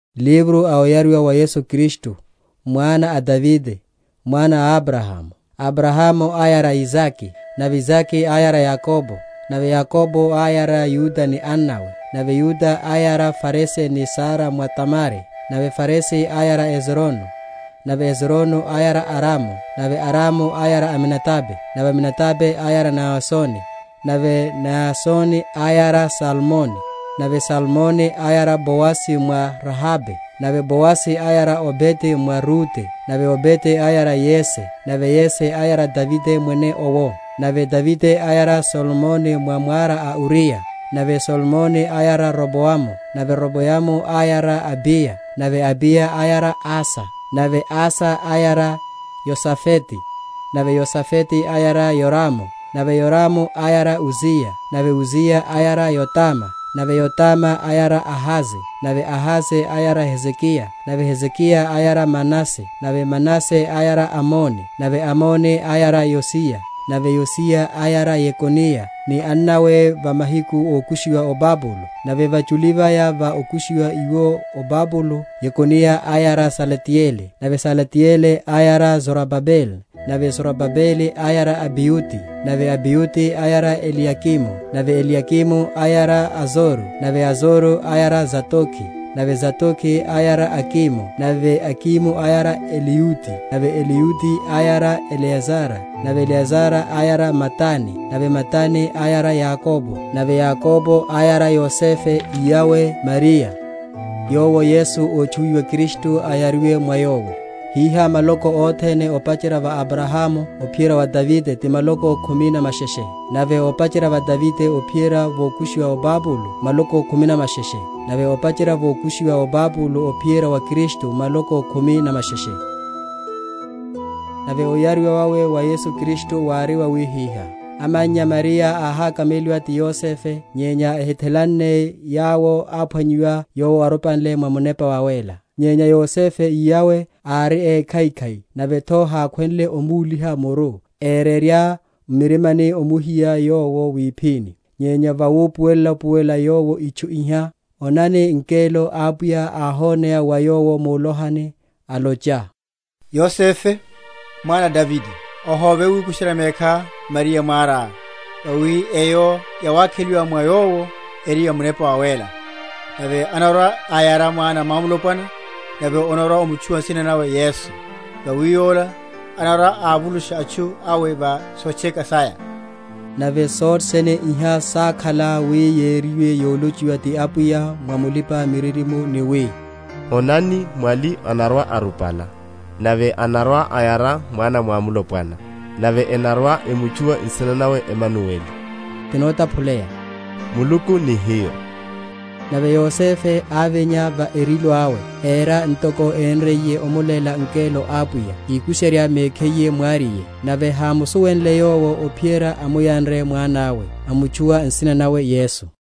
Livro a oyariwa wa Yesu Kristu, mwana a Davide, mwana a Abrahamu. Abrahamu áyara Isake; nave Isake áyara Yakobo; nave Yakobo áyara Yuda ni annawe; nave Yuda áyara Farese ni Zara mwa Tamare; nave Farese áyara Ezronu; nave Ezronu áyara Aramu; nave Aramu áyara Aminadabe; nave Aminadabe áyara Naasoni; nave Naasoni áyara Salmoni; nave Salmoni áyara Boazi mwa Rahabe; nave Boazi áyara Obede mwa Rute; nave Obede áyara Yese; nave Yese áyara Davide mwene owo. Nave Davide áyara Solomoni mwa mwara a Uriya; nave Solomoni áyara Roboamu; nave Roboamu áyara Abiya; nave Abiya áyara Asa; nave Asa áyara Yosafete; nave Yosafete áyara Yoramu; nave Yoramu áyara Uziya; nave Uziya áyara Yotama; nave Yotama áyara Ahaze; nave Ahaze áyara Hezekiya; nave Hezekiya áyara Manase; nave Manase áyara Amoni; nave Amoni áyara Yosiya; nave Yosiya áyara Yekoniya ni annawe va mahiku ókushiwa o Babulo. Nave vachuli vaya va okushiwa iwo o Babulo, Yekoniya áyara Salatieli; nave Salatieli áyara Zorobabele; nave Zorobabele áyara Abiyudi; nave Abiyudi áyara Eliyakimu; nave Eliyakimu áyara Azoro; nave Azoro áyara Sadoki; nave Sadoki áyara Akimu; nave Akimu áyara Eliyudi; nave Eliyudi áyara Eleazara; nave Eleazara áyara Matani; nave Matani áyara Yakobo; nave Yakobo áyara Yosefe, iyawe a Mariya, yowo Yesu otchuwiwa Kristu áyariwe mwa yowo. Hiha maloko othene opacherya va Abrahamu ophiyerya va Davide ti maloko khumi na masheshe; nave opacherya va Davide ophiyerya vókushiwa o Babulo maloko khumi na masheshe; nave opacherya vókushiwa o Babulo ophiyerya wa Kristu maloko khumi na masheshe. Oyariwa wawe wa Yesu Kristu. Nave oyariwa wawe wa Yesu Kristu wári wawihiha: Amannya Mariya áhakameliwa ti Yosefe, nyenya ehithelanne yawo, áphwanyiwa yowo arupanle mwa Munepa Wawéla. Nyenya Yosefe iyawe, ári ékhaikhai, nave’tho hákhwenle omúliha muru, érerya m’murimani omuhiya yowo wiphini. Nyenya vawupuwela?-?upuwela yowo itchu iha, onani, ngelo a Apwiya áhoneya wa yowo mulohani, alocha, Yosefe, mwana a Davide, ohóve wikusherya mekhá Mariya mwará; vawi eyo yawakheliwa mwa yowo eri ya Munepa Wawéla. Nave anarwa‐ayara mwana mwamulopwana, nave onarwa‐omutchuwa nsina nawe Yesu; vawi Yola anarwa‐avulusha atchu awe wa sotcheka saya. Nave sothe sene iha sákhala wi yériwe yolochiwa ti Apwiya mwa mulipa‐miririmo, ni wi, Onani mwali anarwa‐arupala, Nave anarwa‐ayara mwana mwamulopwana, Nave enarwa‐emutchuwa nsina nawe Emanueli; ti notaphuleya, Muluku ni Hiyo. Nave Yosefe ávinya va erilo awe, éra ntoko énriye omuléla ngelo a Apwiya, íkusherya mekhiye mwariye; nave hámusuwenle yowo ophiyerya amuyanre mwanawe; amutchuwa nsina nawe Yesu.